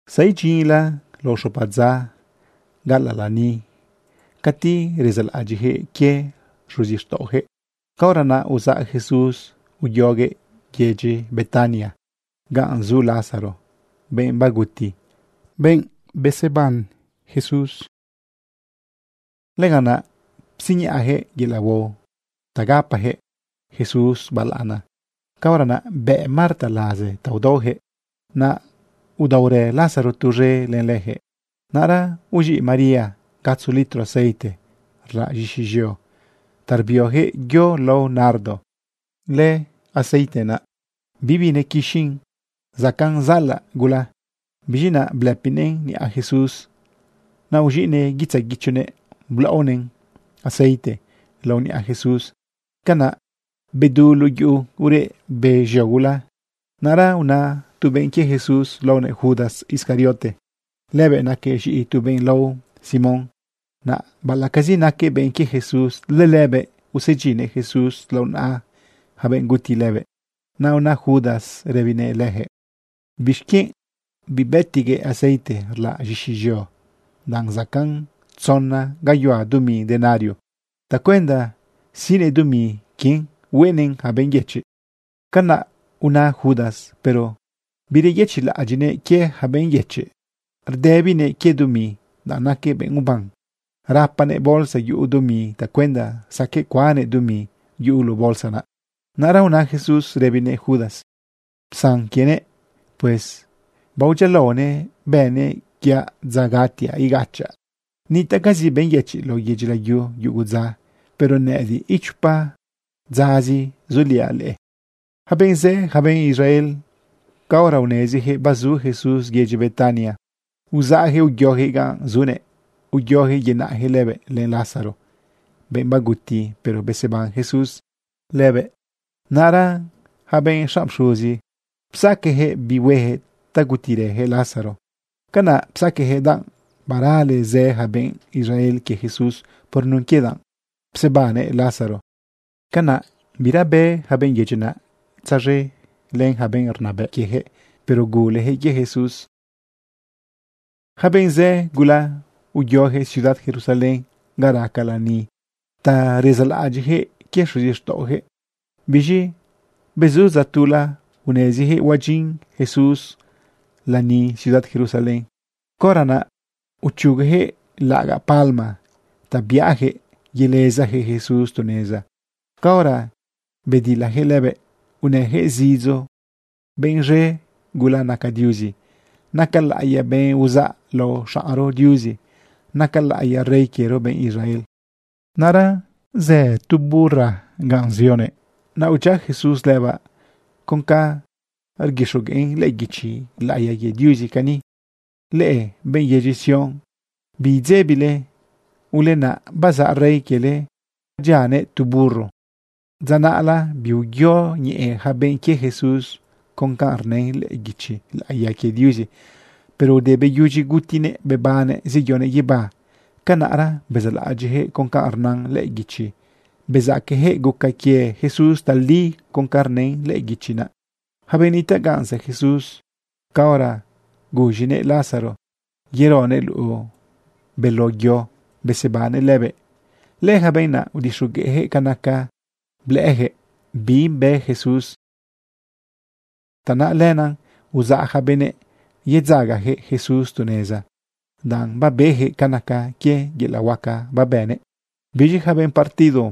Zaidyinla lao xopa dza gaꞌalaꞌ lani cati rezaꞌlaꞌadyiꞌyaquëꞌ quie xuzixtaꞌoyaquëꞌ. Caora naꞌ uzaꞌ Jesús uyoguëꞌ yedyi Betania ganꞌ zu Lázaro, benꞌ baguti, pero beseban Jesús lëbëꞌ. Lëganꞌ naꞌ psiñaꞌayaquëꞌ yelaꞌ huao ta gapayaquëꞌ Jesús balaꞌana. Caora naꞌ bë Marta laze ta udaoyaquëꞌ, naꞌ udaorë Lázaro tuz̃e len leyaquëꞌ. Naꞌra uz̃iꞌ María gatzo litro aceite rlaꞌ z̃ixi z̃eo ta rbioyaquëꞌ yo lao nardo. Lëaceite naꞌ bibi nequixin, zacaꞌn zaꞌalaꞌ gula. Biz̃i naꞌ blëpinëꞌn niꞌa Jesús, naꞌ uz̃iꞌnëꞌ guitzaꞌ guichonëꞌ blaꞌonëꞌn aceite laꞌo niꞌa Jesús. Canaꞌ bedu luꞌu yuꞌu ureꞌ be z̃eo gula. Naꞌra una tu benꞌ quie Jesús laonëꞌ Judas Iscariote. Lëbëꞌ naquëꞌ z̃iꞌi tu benꞌ lao Simón. Naꞌ baꞌalaꞌcazi naquëꞌ benꞌ quie Jesús, lëlëbëꞌ usedyinnëꞌ Jesús lao naꞌa yaca benꞌ guti lëbëꞌ. Naꞌ una Judas rëbinëꞌ leyaquëꞌ: ―¿Bixquienꞌ bibëtiꞌguëꞌ aceite rlaꞌ z̃ixi z̃eo, danꞌ zacaꞌn tzona gayuhua dumi denario tacuenda siꞌnëꞌ dumi quien hueꞌnëꞌn yaca benꞌ yëchiꞌ? Canaꞌ una Judas, pero bireyëchiꞌlaꞌadyiꞌnëꞌ quie yaca benꞌ yëchiꞌ. Rdëbinëꞌ quie dumi, danꞌ naquëꞌ benꞌ uban. Rapanëꞌ bolsa yuꞌu dumi tacuenda saqueꞌ cuannëꞌ dumi yuꞌu luꞌu bolsa naꞌ. Naꞌra una Jesús rëbinëꞌ Judas: ―Psan quienëꞌ. Pues baodyialaonëꞌ bënëꞌ quie dza gatiaꞌ igachaꞌ. Nitaꞌcazi benꞌ yëchiꞌ lao yedyi layu yugu dza, pero nëꞌëdiꞌ, itu chopa dzazi zuliaꞌ leꞌe. Yaca benꞌ zë, yaca benꞌ Israel, caora uneziyaquëꞌ bazu Jesús yedyi Betania, uzaꞌyaquëꞌ uyoyaquëꞌ ganꞌ zunëꞌ. Uyoyaquëꞌ yenaꞌyaquëꞌ lëbëꞌ len Lázaro, benꞌ baguti, pero beseban Jesús lëbëꞌ. Naꞌra yaca benꞌ xanꞌ pxuzi bapsaqueyaquëꞌ bi hueyaquëꞌ ta gutirëyaquëꞌ Lázaro. Canaꞌ psaqueyaquëꞌ, danꞌ barale zë yaca benꞌ Israel quie Jesús por nun quie danꞌ psebannëꞌ Lázaro. Canaꞌ bira bë yaca benꞌ yedyi naꞌ tzaz̃e len yaca benꞌ rnabëꞌ quieyaquëꞌ, pero guleyaquëꞌ quie Jesús. Yaca benꞌ zë gula uyoyaquëꞌ ciudad Jerusalén ga raca lani ta rezaꞌlaꞌadyiꞌyaquëꞌ quie xuzixtaꞌoyaquëꞌ. Biz̃i bezu dza tula uneziyaquëꞌ huadyin Jesús lani ciudad Jerusalén. Caora naꞌ uchugoyaquëꞌ laꞌagaꞌ palma ta biꞌayaquëꞌ yelezayaquëꞌ Jesús tu neza. Caora bedilayaquëꞌ lëbëꞌ unëyaquëꞌ zidzo: ―Benꞌ z̃e gula naca Diuzi. Naca laꞌiya benꞌ uzaꞌ lao xaꞌnro Diuzi. Naca laꞌiya rey quiero, benꞌ Israel. Naꞌra zë tu burra ganꞌ zioguëꞌ. Naꞌ udyia Jesús lëbaꞌ con ca rguixogueꞌn lëꞌë guichi laꞌiya quie Diuzi cani: Leꞌe benꞌ yedyi Sión, biidzebile. Ulenaꞌ bazaꞌ Rey quiele, bdyianëꞌ tu burro. Dza naꞌla biuyoñeꞌe yaca benꞌ quie Jesús con ca rnën lëꞌë guichi laꞌiya quie Diuzi. Pero ude beyudyi gutinëꞌ bebannëꞌ zeyonëꞌ guibá, canaꞌra bezaꞌlaꞌadyiꞌyaquëꞌ con ca rna lëꞌë guichi. Bezaqueyaquëꞌ guca quie Jesús tali con ca rnën lëꞌë guichi naꞌ. Yaca benëꞌ nitaꞌ ganꞌ zë Jesús caora guz̃inëꞌ Lázaro yeronëꞌ luꞌu beló yo besebannëꞌ lëbëꞌ, lëyaca benꞌ naꞌ, udixogueꞌyaquëꞌ ca naca blëꞌëyaquëꞌ bi bë Jesús. Tanaꞌ lenaꞌ uzaꞌ yaca benëꞌ yedzagayaquëꞌ Jesús tu neza, danꞌ babeyaquëꞌ ca naca quie yelaꞌ huaca babënëꞌ. Biz̃i yaca benꞌ partido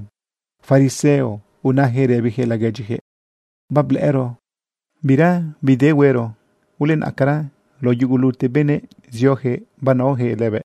fariseo unayaquëꞌ rëbiyaquëꞌ laguedyiyaquëꞌ: ―Bablëꞌëro bira bide huero. Ulenaꞌcara lao yugulute benëꞌ zioyaquëꞌ banaoyaquëꞌ lëbëꞌ.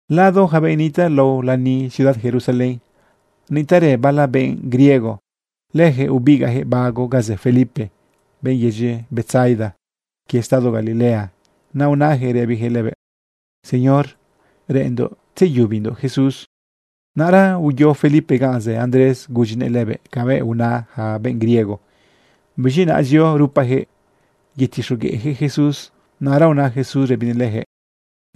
Lado yaca benꞌ nitaꞌ lao lani ciudad Jerusalén, nitaꞌrë bala benꞌ griego. Leyaquëꞌ ubigaꞌyaquëꞌ bago ga zë Felipe, benꞌ yedyi Betsaida quie estado Galilea, naꞌ unayaquëꞌ rëbiyaquëꞌ lëbëꞌ: ―Señor, reꞌenndoꞌ tzeyubindoꞌ Jesús. Naꞌra uyo Felipe ganꞌ zë Andrés gudyinëꞌ lëbëꞌ cabëꞌ una yaca benꞌ griego. Biz̃i naꞌ zio rupayaquëꞌ yetixogueꞌyaquëꞌ Jesús. Naꞌra una Jesús rëbinëꞌ leyaquëꞌ: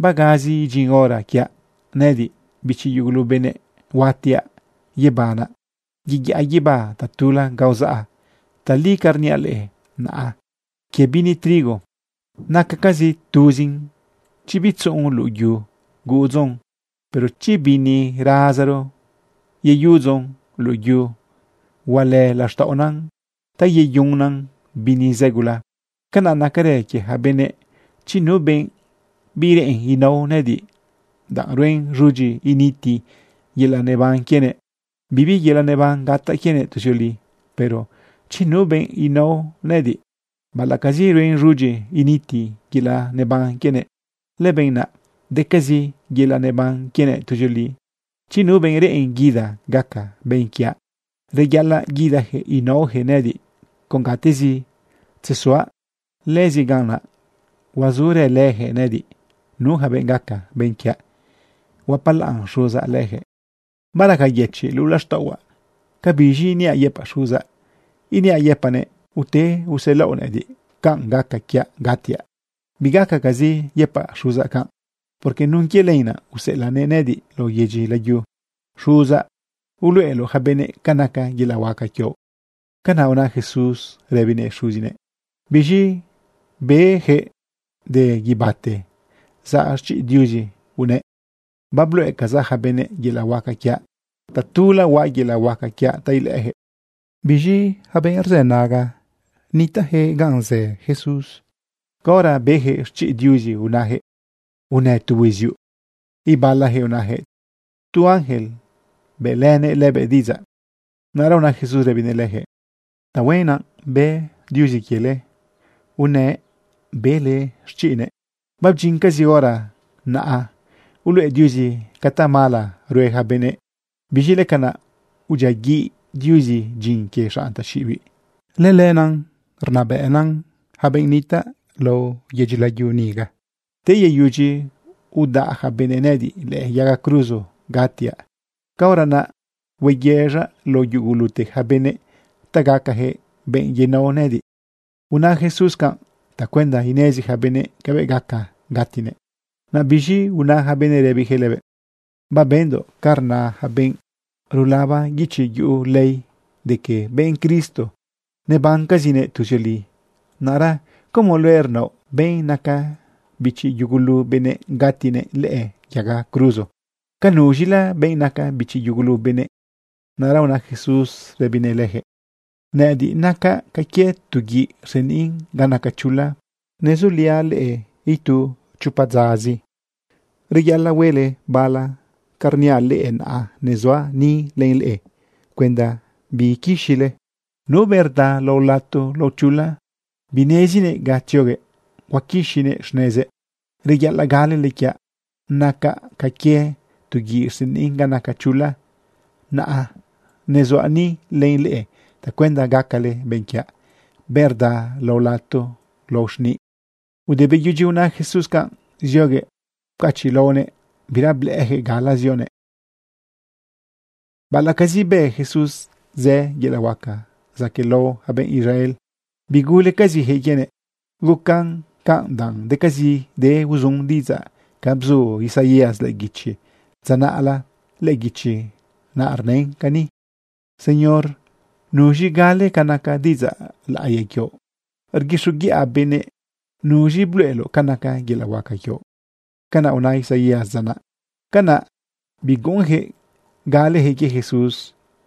―Bagazi idyin hora quiaꞌ nëꞌëdiꞌ, bichi yugulu benëꞌ, huatiaꞌ yebanaꞌ, yeyaꞌa guibá tatula ga uzaꞌa. Tali ca rniaꞌ leꞌe naꞌa quie bini trigo. Nacacazi tuzin chi bitzuꞌun luꞌu yu guꞌudzon. Pero chi bini razaro yeyuꞌudzon luꞌu yu, hualë laxtaꞌona ta yeyunan bini zë gula. Canaꞌ nacarë quie yaca benëꞌ. Chi nu benꞌ bireꞌen inao nëꞌëdiꞌ danꞌ ruen z̃udyi initi yelaꞌ neban quienëꞌ, bibi yelaꞌ neban gataꞌ quienëꞌ tuzioli. Pero chi nu benꞌ inao nëꞌëdiꞌ baꞌalaꞌcazi ruen z̃udyi initi yelaꞌ neban quienëꞌ, lëbenꞌ naꞌ decazi yelaꞌ neban quienëꞌ tuzioli. Chi nu benꞌ reꞌen guida gaca benꞌ quiaꞌ, reyaꞌalaꞌ guidayaquëꞌ inaoyaquëꞌ nëꞌëdiꞌ. Con gatezi tzezuaꞌ, lëzi ganꞌ naꞌ huazurëlëyaquëꞌ nëꞌëdiꞌ. Nu yaca benꞌ gaca benꞌ quiaꞌ, huapalaꞌn Xuzaꞌ leyaquëꞌ. ’Baraca yëchiꞌ luꞌu laxtaꞌohuaꞌ. ¿Cabiz̃i iniaꞌ yëpaꞌ Xuzaꞌ? ¿Iniaꞌ yëpaꞌnëꞌ: “Ute uselaoꞌ nëꞌëdiꞌ canꞌ gaca quiaꞌ gatiaꞌ”? Bigacacazi yëpaꞌ Xuzaꞌ canꞌ, porque nun quie lenaꞌ useꞌelaꞌnëꞌ nëꞌëdiꞌ lao yedyi layu. Xuzaꞌ, uluꞌeloꞌ yaca benëꞌ ca naca yelaꞌ huaca quioꞌ. ―Canaꞌ una Jesús rëbinëꞌ Xuzinëꞌ. Biz̃i beyaquëꞌ de guibáte zaꞌ xchiꞌ Diuzi unëꞌ: ―Babluꞌecazaꞌ yaca benëꞌ yelaꞌ huaca quiaꞌ. Tatula huaꞌ yelaꞌ huaca quiaꞌ ta ilëꞌëyaquëꞌ. Biz̃i yaca benꞌ rzënaga nitaꞌyaquëꞌ ganꞌ zë Jesús, caora beyaquëꞌ xchiꞌ Diuzi unayaquëꞌ: ―Unë tu huiziuꞌ. Ibalayaquëꞌ unayaquëꞌ: ―Tu ángel bëꞌlënë lëbëꞌ diꞌidzaꞌ. Naꞌra una Jesús rëbinëꞌ leyaquëꞌ: ―Tahuen naꞌ bë Diuzi quiele unëꞌ bele xchiꞌnëꞌ. Babdyincazi hora naꞌa uluꞌe Diuzi ca tamala rue yaca benëꞌ. Biz̃i lëcanaꞌ udyiaguiꞌ Diuzi dyin quie xanꞌ taxiꞌibiꞌ. Lëlëna rnabëꞌna yaca benëꞌ nitaꞌ lao yedyi layu niga. Te yeyudyi udaꞌ yaca benëꞌ nëꞌëdiꞌ lëꞌë yaga cruzo gatiaꞌ, caora naꞌ hueyëz̃aꞌ lao yugulute yaca benëꞌ ta gacayaquëꞌ benꞌ yenao nëꞌëdiꞌ. Una Jesús canꞌ tacuenda inezi yaca benëꞌ cabëꞌ gaca gatinëꞌ. Naꞌ biz̃i una yaca benëꞌ rëbinëꞌ lëbëꞌ: ―Babendoꞌ ca rna yaca benꞌ rulaba guichi yuꞌu ley de que benꞌ Cristo nebancazinëꞌ tuzioli. Naꞌra ¿cómo luëꞌ rnaoꞌ benꞌ naca bichi yugulu benëꞌ gatinëꞌ lëꞌë yaga cruzo? ¿Ca nuz̃ila benꞌ naca bichi yugulu benëꞌ? Naꞌra una Jesús rëbinëꞌ leyaquëꞌ: ―Nëꞌëdiꞌ nacaꞌ ca quie tu guiꞌ rseniꞌn ga naca chula. Nezuliaꞌ leꞌe itu chopa dzazi. Reyaꞌalaꞌ huele bala ca rniaꞌ leꞌe naꞌa nezuaꞌ ni len leꞌe cuenda biquixile. Nu benꞌ rda lao lato lao chula, binezinëꞌ ga tzioguëꞌ huaquixinëꞌ xnezëꞌ. Reyaꞌalaꞌ galele quiaꞌ nacaꞌ ca quie tu guiꞌ rseniꞌn ga naca chula naꞌa nezuaꞌ ni len leꞌe tacuenda gacale benꞌ quiaꞌ, benꞌ rda lao lato lao xniꞌ. Ude beyudyi una Jesús canꞌ, zioguëꞌ pcachiꞌlaonëꞌ, bira blëꞌëjëꞌ gala zionëꞌ. Baꞌalaꞌcazi bë Jesús zë yelaꞌ huaca zaquëꞌlao yaca benëꞌ Israel, bigulecaziyaquëꞌ quienëꞌ. Guca canꞌ danꞌ decazide uzun diꞌidzaꞌ ca bzu Isaías lëꞌë guichi dza naꞌla. Lëꞌë guichi naꞌ rnën cani: Señor, ¿nuz̃i gale ca naca diꞌidzaꞌ laꞌiya quioꞌ rguixoguiꞌa benëꞌ. ¿Nuz̃i bluꞌeloꞌ ca naca yelaꞌ huaca quioꞌ? Canaꞌ una Isaías dza naꞌ. Canaꞌ biguꞌunyaquëꞌ galeyaquëꞌ quie Jesús.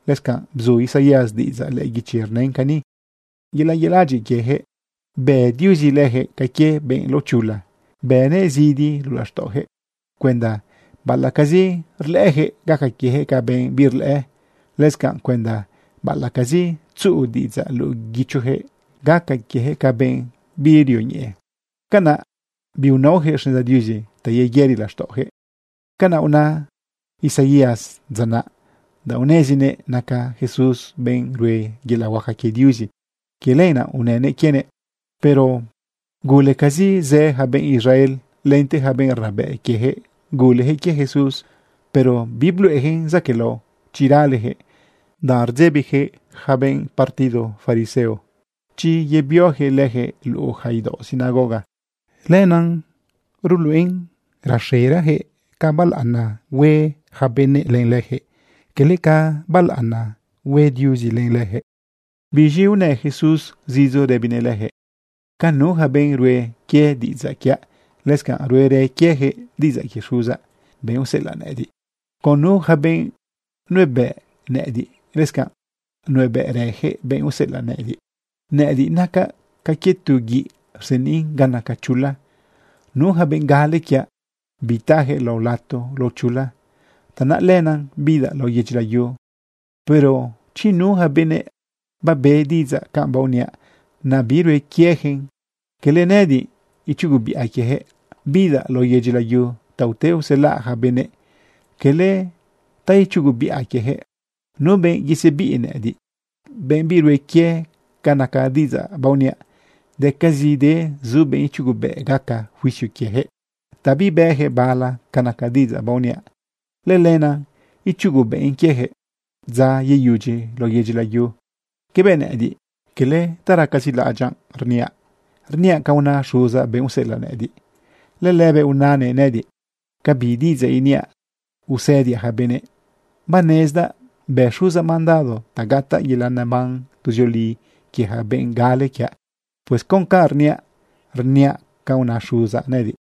Lëscanꞌ bzu Isaías diꞌidzaꞌ lëꞌë guichi rnën cani: Yelaꞌ yeladyiꞌ quieyaquëꞌ bë Diuzi leyaquëꞌ ca quie benꞌ laochula, bënëꞌ zidi luꞌu laxtaꞌoyaquëꞌ, cuenda baꞌalaꞌcazi rlëꞌëyaquëꞌ, gaca quieyaquëꞌ ca benꞌ birlëꞌë, lëscanꞌ cuenda baꞌalaꞌcazi tzuꞌu diꞌidzaꞌ luꞌu guichoyaquëꞌ, gaca quieyaquëꞌ ca benꞌ birioñeꞌe. Canaꞌ biinaoyaquëꞌ xneza Diuzi ta yeyëri laxtaꞌoyaquëꞌ. Canaꞌ una Isaías dza naꞌ danꞌ unezinëꞌ naca Jesús benꞌ rue yelaꞌ huaca quie Diuzi. Quie lenaꞌ unënëꞌ quienëꞌ. Pero gulecazi zë yaca benꞌ Israel, lente yaca benꞌ rnabëꞌ quiejëꞌ guleyaquëꞌ quie Jesús. Pero bibluꞌeyaquëꞌn zaquëꞌlao chi raleyaquëꞌ, danꞌ rdzebiyaquëꞌ yaca benꞌ partido fariseo chi yebioyaquëꞌ leyaquëꞌ luꞌu yaca idaoꞌ sinagoga. Lenaꞌ rluꞌen raxerayaquëꞌ ca balaꞌana hue yaca benëꞌ len leyaquëꞌ, quele ca balaꞌana hue Diuzi len leyaquëꞌ. Biz̃i unë Jesús zidzo rëbinëꞌ leyaquëꞌ: ―Con nu yaca benꞌ rue quie diꞌidzaꞌ quiaꞌ, lëscanꞌ ruerë quieyaquëꞌ diꞌidzaꞌ quie Xuzaꞌ, benꞌ useꞌelaꞌ nëꞌëdiꞌ. Con nu yaca benꞌ nuebëꞌ nëꞌëdiꞌ, lëscanꞌ nuebëꞌrëyaquëꞌ benꞌ useꞌelaꞌ nëꞌëdiꞌ. Nëꞌëdiꞌ nacaꞌ ca quie tu guiꞌ rseniꞌn ga naca chula. Nu yaca benꞌ gale quiaꞌ, bitayaquëꞌ lao lato lao chula. Tanaꞌ lenaꞌ bidaꞌ lao yedyi layu. Pero chi nu yaca benëꞌ babe diꞌidzaꞌ canꞌ baoniaꞌ, naꞌ birue quieyaquen, cala nëꞌëdiꞌ ichugobiꞌa quieyaquëꞌ. Bidaꞌ lao yedyi layu ta ute uselaꞌ yaca benëꞌ, cala ta ichugobiꞌa quieyaquëꞌ. Nu benꞌ yesebiꞌ nëꞌëdiꞌ, benꞌ birue quie ca naca diꞌidzaꞌ baoniaꞌ, decazide zu benꞌ ichugobëꞌ gaca juicio quieyaquëꞌ. Ta bibëyaquëꞌ bala ca naca diꞌidzaꞌ baoniaꞌ, lëlenaꞌ ichugobëꞌn quieyaquëꞌ dza yeyudyi lao yedyi layu. Cabëꞌ nëꞌëdiꞌ, quele ta racazi laꞌadyaꞌ rniaꞌ. Rniaꞌ ca una Xuzaꞌ, benꞌ useꞌelaꞌ nëꞌëdiꞌ. Lëlëbëꞌ unanëꞌ nëꞌëdiꞌ ca bi diꞌidzaꞌ iniaꞌ usëdiaꞌ yaca benëꞌ. Banezdaꞌ bë Xuzaꞌ mandado ta gataꞌ yelaꞌ neban tuzioli quie yaca benꞌ gale quiaꞌ. Pues con canꞌ rniaꞌ, rniaꞌ ca una Xuzaꞌ nëꞌëdiꞌ.